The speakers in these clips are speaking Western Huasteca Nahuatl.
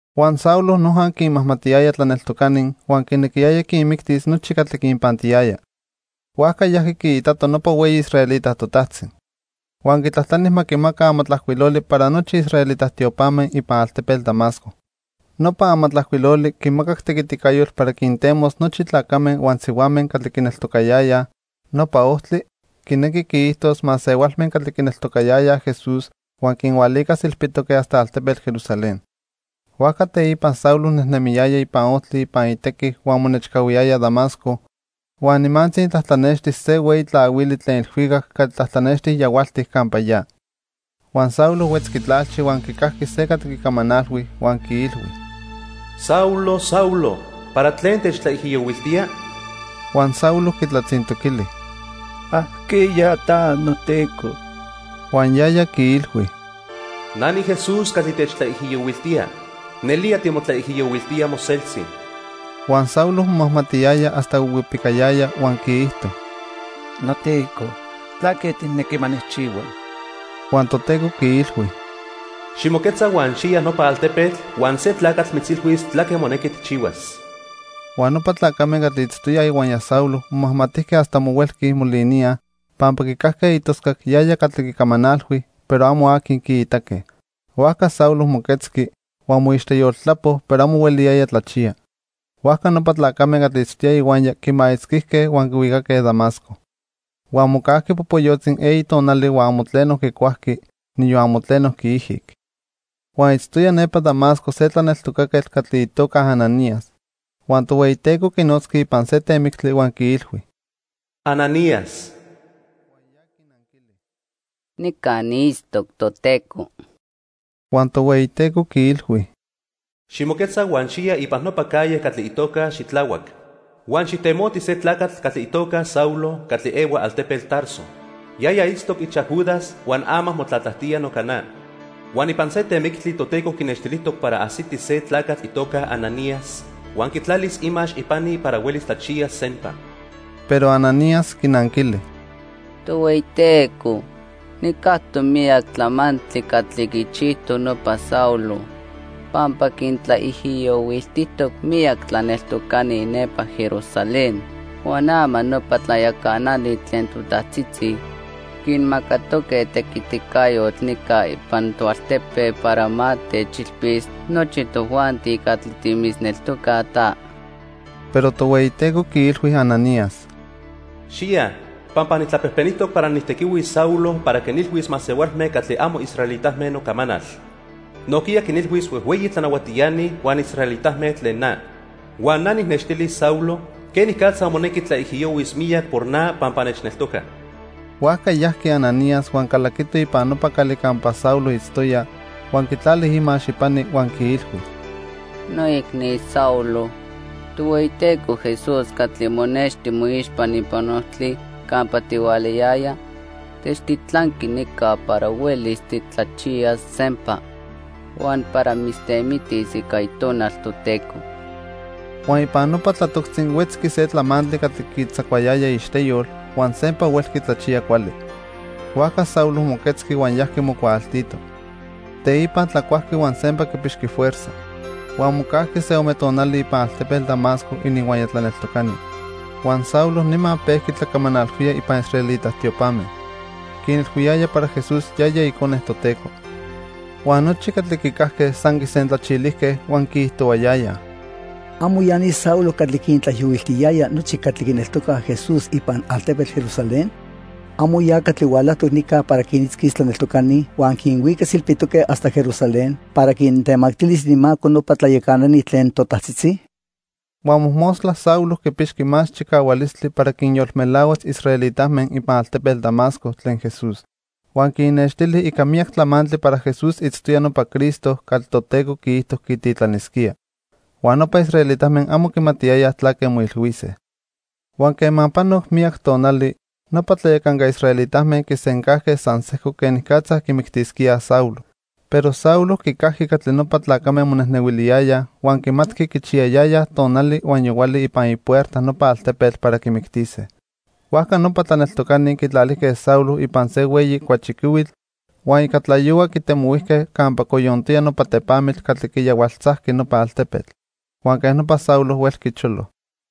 Huan Saulo noja quinmajmatiyaya tlaneltocani huan quinequiyaya quinmictis nochi catli quinpantiyaya. Huajca yajqui quiitato nopa hueyi israelita totajtzi. Huan quitlajtlani ma quimaca amatlajcuiloli para nochi israelita tiopame ipan altepetl Damasco. Nopa amatlajcuiloli quimacac tequiticayotl para quintemos nochi tlacame huan sihuame catli quineltocayayaj "Nopa Ojtli", quinequi quiijtos masehualme catli quineltocayayaj Jesús, huan quinhualicas ilpitoque hasta altepetl Jerusalén. Huajca teipa Saulo nejnemiyaya ipan ojtli ipan itequi huan monechcahuiyaya Damasco, huan nimantzi tlatlanexti se hueyi tlahuili tlen ilhuicac catli tlatlanexti yahualtic campa ya. Huan Saulo huetzqui tlalchi huan quicajqui se catli quicamanalhui huan quiilhui: "Saulo, Saulo, ¿para tlen techtlaijiyohuiltía?" Huan Saulo quitlatzintoquili: "¿Ajqueya ta, noTeco?" Huan yaya quiilhui: "Na niJesús catli techtlaijiyohuiltía. Nelía timotlaijiyohuiltía moseltzi." Huan Saulo momajmatiyaya hasta huihuipicayaya huan quiijto: "NoTeco, ¿tlaque tijnequi ma nijchihua?" Huan Toteco quiilhui: "Ximoquetza huan xiya nopa altepetl, huan se tlacatl mitzilhuis tlaque monequi tijchihuas." Huan nopa tlacame catli itztoyaj ihuaya Saulo momajmatijque hasta amo huelqui moliníaj, pampa quicajque itoscac yaya catli quicamanalhui, pero amo aqui quiitaque. Huajca Saulo moquetzqui, huan moixteyoltlapo, pero amo hueliyaya tlachiya. Huajca nopa tlacame catli itztoyaj ihuaya quimaitzquijque huan quihuicaque Damasco. Huan mocajqui popoyotzi eyi tonali huan amo tleno quicuajqui, niyon amo tleno quiijic. Huan itztoya nepa Damasco se tlaneltocaquetl catli itoca Ananías. Huan Tohueyiteco quinotzqui ipan se temictli huan quiilhui: "Ananías." Huan ya quinanquili: "Nica niitztoc, Toteco." Huan Tohueyiteco quiilhui: "Ximoquetza huan xiya ipan nopa calle catli itoca 'Xitlahuac'. Huan xijtemoti se tlacatl catli itoca Saulo catli ehua altepetl Tarso. Yaya itztoc ichaj Judas huan ama motlatlajtía noca na. Huan ipan se temictli Toteco quinextilijtoc para ajsiti se tlacatl itoca Ananías huan quitlalis imax ipani para huelis tlachiyas sempa." Pero Ananías quinanquili: —Tohueyiteco, nijcactoc miyac tlamantli catli quichijtoc nopa Saulo, pampa quintlaijiyohuiltijtoc miyac tlaneltocani nepa Jerusalén. Huan ama nopa tlayacanani tlen totajtzitzi quimacatoque tequiticayotl nica ipan toaltepe para ma techilpis nochi tojuanti catli timitzneltocaj ta. Pero Tohueyiteco quiilhui Ananías: —Xiya, pampa nijtlapejpenijtoc para nijtequihuis Saulo para quinilhuis masehualme catli amo israelitame nocamanal. Nojquiya quinilhuis huejhueyi tlanahuatiani huan israelitame tlen na. Huan na nijnextilis Saulo quenicatza monequi tlaijiyohuis miyac por na pampa nechneltoca. Huajca yajqui Ananías huan calaquito ipan nopa cali campa Saulo itztoya, huan quitlali imax ipani huan quiilhui: —Noicni Saulo, Tohueyiteco Jesús catli monexti moixpa ipan ojtli campa tihualayaya, nechtitlanqui nica para huelis titlachiyas sempa huan para mitztemitis ica Itonal Toteco. Huan ipan nopa tlatoctzi huetzqui se tlamantli catli quitzacuayaya iixteyol, huan sempa huelqui tlachiya cuali. Huajca Saulo moquetzqui huan yajqui mocuaaltito. Teipa tlacuajqui huan sempa quipixqui fuerza. Huan mocajqui se ome tonali ipan altepetl Damasco ininhuaya tlaneltocani. Huan Saulo nima pejqui tlacamanalhuía ipan israelita tiopame. Quinilhuiyaya para Jesús yaya Icone Toteco. Huan nochi catli quicajque san quisentlachilijque huan quiijtohuayayaj: —¿Amo ya ni Saulo catli quintlaijiyohuiltiyaya nochi catli quineltocaj Jesús ipan altepetl Jerusalén? ¿Amo ya catli hualajtoc nica para quinitzquis tlaneltocani huan quinhuicas ilpitoque hasta Jerusalén para quintemactilis ininmaco nopa tlayacanani tlen totajtzitzi? Huan mojmostla Saulo quipixqui más chicahualistli para quinyolmelahuas israelitame ipan altepetl Damasco tlen Jesús. Huan quinnextili ica miyac tlamantli para Jesús itztoya nopa Cristo catli Toteco quiijto quititlanisquía. Huan nopa israelitame amo quimatiyayaj tlaque moilhuise. Huan quema panoc miyac tonali, nopa tlayacanca israelitame quisencajque san sejco quenicatza quimictisquíaj Saulo. Pero Saulo quicajqui catli nopa tlacame monejnehuiliyayaj huan quimatqui quichiyayayaj tonali huan yohuali ipan ipuerta nopa altepetl para quimictise. Huajca nopa tlaneltocani quitlalijque Saulo ipan se hueyi cuachiquihuitl, huan ica tlayohua quitemohuijque campa coyontoya nopa tepamitl catli quiyahualtzajqui nopa altepetl. Huan quej nopa Saulo huelqui cholo.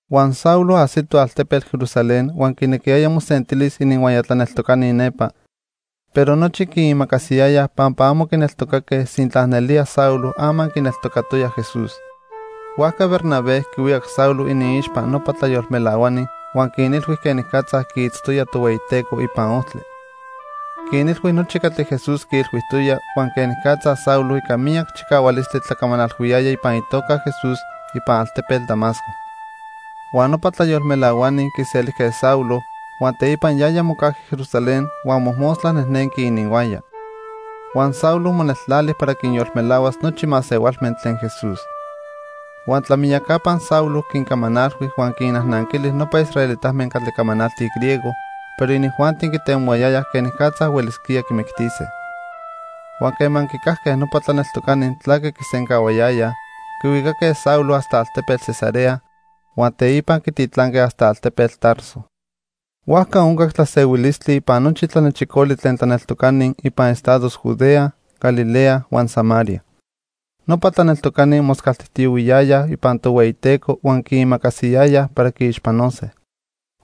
Huan Saulo ajsito altepetl Jerusalén huan quinequiyaya mosentilis ininhuaya tlaneltocani nepa, pero nochi quiimacasiyayaj pampa amo quineltocaque sintla nelía Saulo ama quineltocatoya Jesús. Huajca Bernabé quihuicac Saulo iniixpa nopa tlayolmelahuani huan quinilhui quenicatza quiitztoya Tohueyiteco ipan ojtli. Quinilhui nochi catli Jesús quiilhuijtoya huan quenicatza Saulo ica miyac chicahualistli tlacamanalhuiyaya ipan itoca Jesús ipan altepetl Damasco. Huan nopa tlayolmelahuani quiselijque Saulo, huan teipa yaya mocajqui Jerusalén huan mojmostla nejnenqui ininhuaya. Huan Saulo moneltlali para quinyolmelahuas nochi masehualme tlen Jesús. Huan tlamiyacapa Saulo quincamanalhui huan quinnajnanquili nopa israelitame catli camanaltij griego; pero inijuanti quitemoyayaj quenicatza huelisquía quimictise. Huan quema quicajque nopa tlaneltocani tlaque quisencahuayayaj, quihuicaque Saulo hasta altepetl Cesarea, huan teipa quititlanque hasta altepetl Tarso. Huajca oncac tlasehuilistli ipan nochi tlanechicoli tlen tlaneltocani ipan estados Judea, Galilea, huan Samaria. Nopa tlaneltocani moscaltijtiyohuiyayaj ipan Tohueyiteco huan quiimacasiyayaj para quiixpanose.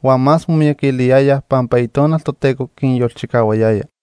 Huan más momiyaquiliyayaj pampa Itonal Toteco quinyolchicahuayaya.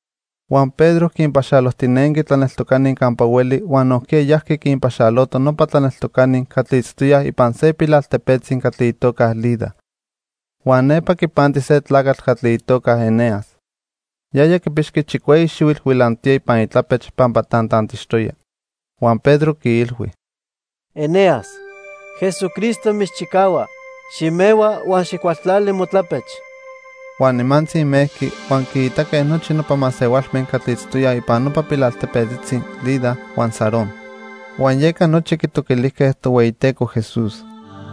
Huan Pedro quinpaxalojtinenqui tlaneltocani campa hueli huan nojquiya yajqui quinpaxaloto nopa tlaneltocani catli itztoyaj ipan se pilaltepetzi catli itoca Lida. Huan nepa quipanti se tlacatl catli itoca Eneas. Yaya quipixqui chicueyi xihuitl huilantoya ipan itlapech pampa tantantixtoya. Huan Pedro quiilhui: —Eneas, Jesucristo mitzchicahua. Ximehua huan xijcualtlali motlapech. Huan nimantzi mejqui, huan quiitaque nochi nopa masehualme catli itztoyaj ipan nopa pilaltepetzitzi Lida huan Sarón. Huan yeca nochi quitoquilijque Tohueyiteco Jesús.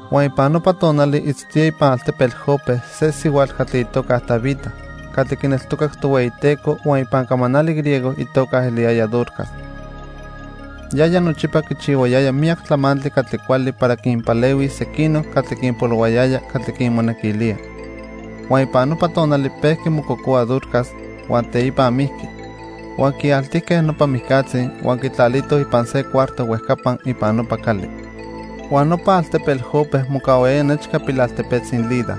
Huan ipan nopa tonali itztoya ipan altepetl Jope se sihuatl catli itoca Tabita catli quineltocac Tohueyiteco huan ipan camanali griego itoca eliyaya Dorcas. Yaya nochipa quichihuayaya miyac tlamantli catli cuali para quinpalehuis sequinoc catli quinpolohuayaya catli quinmonequilía. Huan ipan nopa tonali pejqui mococohua Dorcas huan teipa mijqui. Huan quialtijque nopa mijcatzi, huan quitlalitoj ipan se cuarto huejcapa ipan nopa cali. Huan nopa altepetl Jope mocahuayaya nechca pilaltepetzi Lida,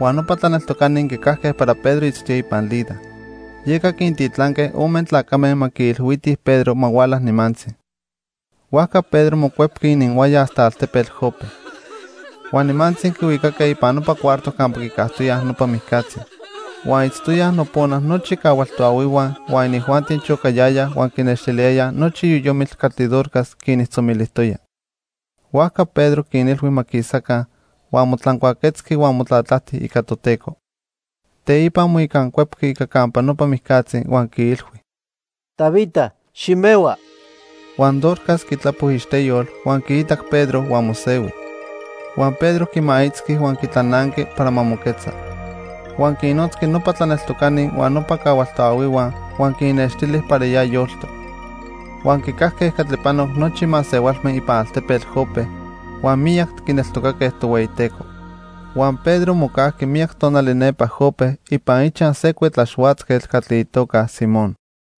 huan nopa tlaneltocani quicajque para Pedro itztoya ipan Lida. Yeca quintitlanque ome tlacame ma quiilhuitij Pedro ma huala nimantzi. Huajca Pedro mocuepqui ininhuaya hasta altepetl Jope. Huan nimantzi quihuicaque ipan nopa cuarto campa quicajtoyaj nopa mijcatzi. Huan itztoyaj nopona nochi cahual toahuihua, huan inijuanti chocayayaj huan quinextiliyayaj nochi yoyomitl catli Dorcas quinijtzomilijtoya. Huajca Pedro quinilhui ma quisaca, huan motlancuaquetzqui huan motlatlajti ica Toteco. Teipa moicancuepqui ica campa nopa mijcatzi huan quiilhui: —Tabita, ximehua. Huan Dorcas quitlapo iixteyol, huan quiitac Pedro huan mosehui. Huan Pedro quimaitzqui huan quitlananqui para ma moquetza. Huan quinnotzqui nopa tlaneltocani huan nopa cahual toahuihua, huan quinnextili para ya yoltoc. Huan quicajque catli panoc nochi masehualme ipan altepetl Jope, huan miyac quineltocaque Tohueyiteco. Huan Pedro mocajqui miyac tonali nepa Jope ipan ichaj se cuetlaxhuatzquetl catli itoca Simón.